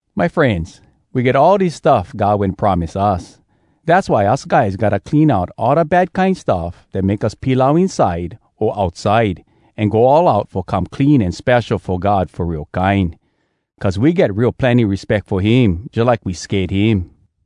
My frenz, we get all dis stuff God wen promise us. Dass why us guys gotta clean out all da bad kine stuff dat make us pilau inside o outside, an go all out fo come clean an spesho fo God fo real kine, cuz we get real plenny respeck fo him jalike we sked him.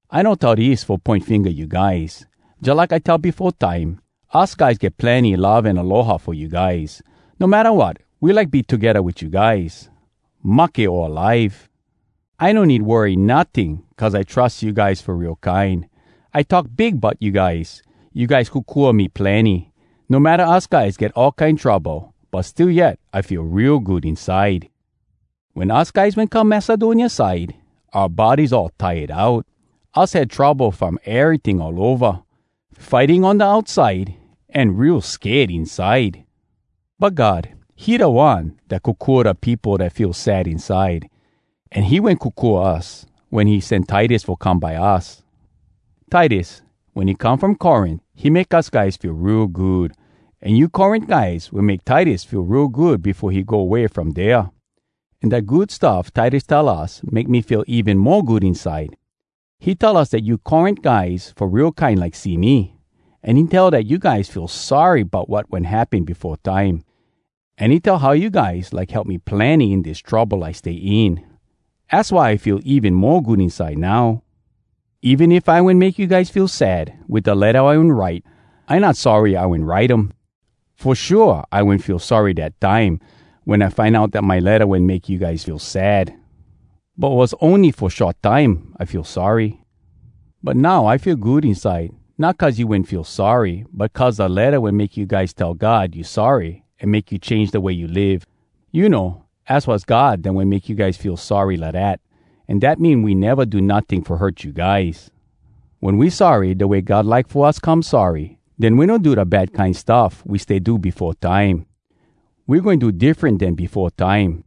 I no tell dis fo poin finga you guys. Jalike I tell befo time, us guys get plenny love an aloha fo you guys. No matta wat, we like be togedda wit you guys, mahke o alive! I no need worry notting cuz I trus you guys fo real kine. I talk big bout you guys. You guys kokua me plenny. No matta us guys get all kine trouble, but still yet I feel real good inside. Wen us guys wen come Macedonia side, oua bodies all tired out. Us had trouble from eryting all ova, fighting on da outside, an real sked inside. But God, he da One dat kokua da peopo dat feel sad inside, an he wen kokua us wen he sen Titus fo come by us. Titus, wen he come from Corint, he make us guys feel real good. An you Corint guys wen make Titus feel real good befo he go way from dea. An dat good stuff Titus tell us make me feel even mo good inside. He tell us dat you Corint guys fo real kine like see me. An he tell dat you guys feel sorry bout wat wen happen befo time. An he tell how you guys like help me plenny in dis trouble I stay in. Az why I feel even mo good inside now. Even if I wen make you guys feel sad wit da letta I wen write, I not sorry I wen write um. Fo shua I wen feel sorry dat time wen I find out dat my letta wen make you guys feel sad. But was ony fo short time I feel sorry. But now I feel good inside, not cuz you wen feel sorry, but cuz da letta wen make you guys tell God you sorry an make you change da way you live. You know, az was God dat wen make you guys feel sorry lidat. An dat mean we neva do notting fo hurt you guys. Wen we sorry da way God like fo us come sorry, den we no do da bad kine stuff we stay do befo time. We goin do diffren den befo time.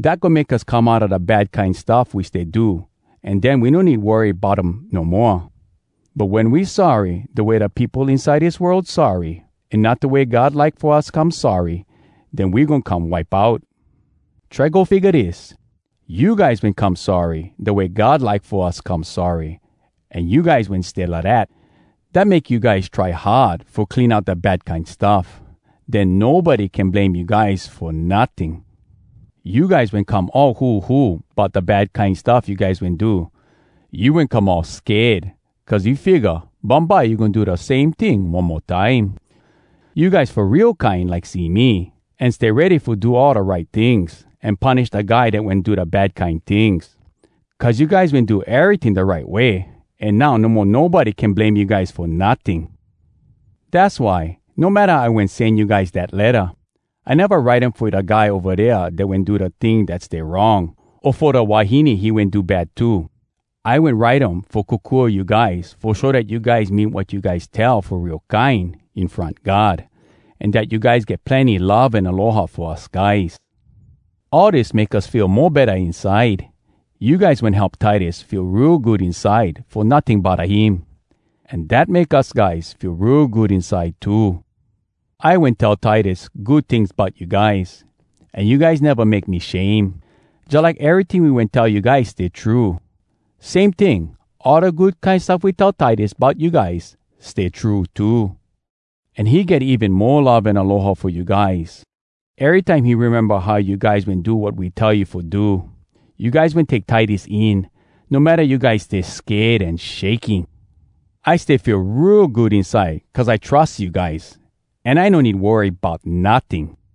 Dat goin make us come outa da kine bad stuff we stay do, an den we no need worry bout um no moa. But wen we sorry da way da peopo inside dis world sorry, an not da way God like fo us come sorry, den we goin come wipe out. Try go figga dis! You guys wen come sorry da way God like fo us come sorry, an you guys wen stay lidat. Dat make you guys try hard fo clean out da bad kine stuff. Den nobody can blame you guys fo notting. You guys wen come all huhu bout da bad kine stuff you guys wen do. You wen come all sked, cuz you figga bumbye you goin do da same ting one mo time. You guys fo real kine like see me, an stay ready fo do all da right tings, an punish da guy dat wen do da bad kine tings. Cuz you guys wen do eryting da right way, an now no mo nobody can blame you guys fo notting. Dass why, no matta I wen sen you guys dat letta, I neva write um fo da guy ova dea dat wen do da ting dat stay wrong, o fo da wahine he wen do bad to. I wen write um fo kokua you guys fo show dat you guys mean wat you guys tell fo real kine in front God, an dat you guys get plenny love an aloha fo us guys. All dis make us feel mo betta inside. You guys wen help Titus feel real good inside fo notting bodda him. An dat make us guys feel real good inside too. I wen tell Titus good tings bout you guys, an you guys neva make me shame. Jalike eryting we wen tell you guys stay true, same ting, all da good kine stuff we tell Titus bout you guys stay true too. An he get even mo love an aloha fo you guys erytime he rememba how you guys wen do wat we tell you fo do. You guys wen take Titus in, no matta you guys stay sked an shaking. I stay feel real good inside cuz I trus you guys, an I no need worry bout notting!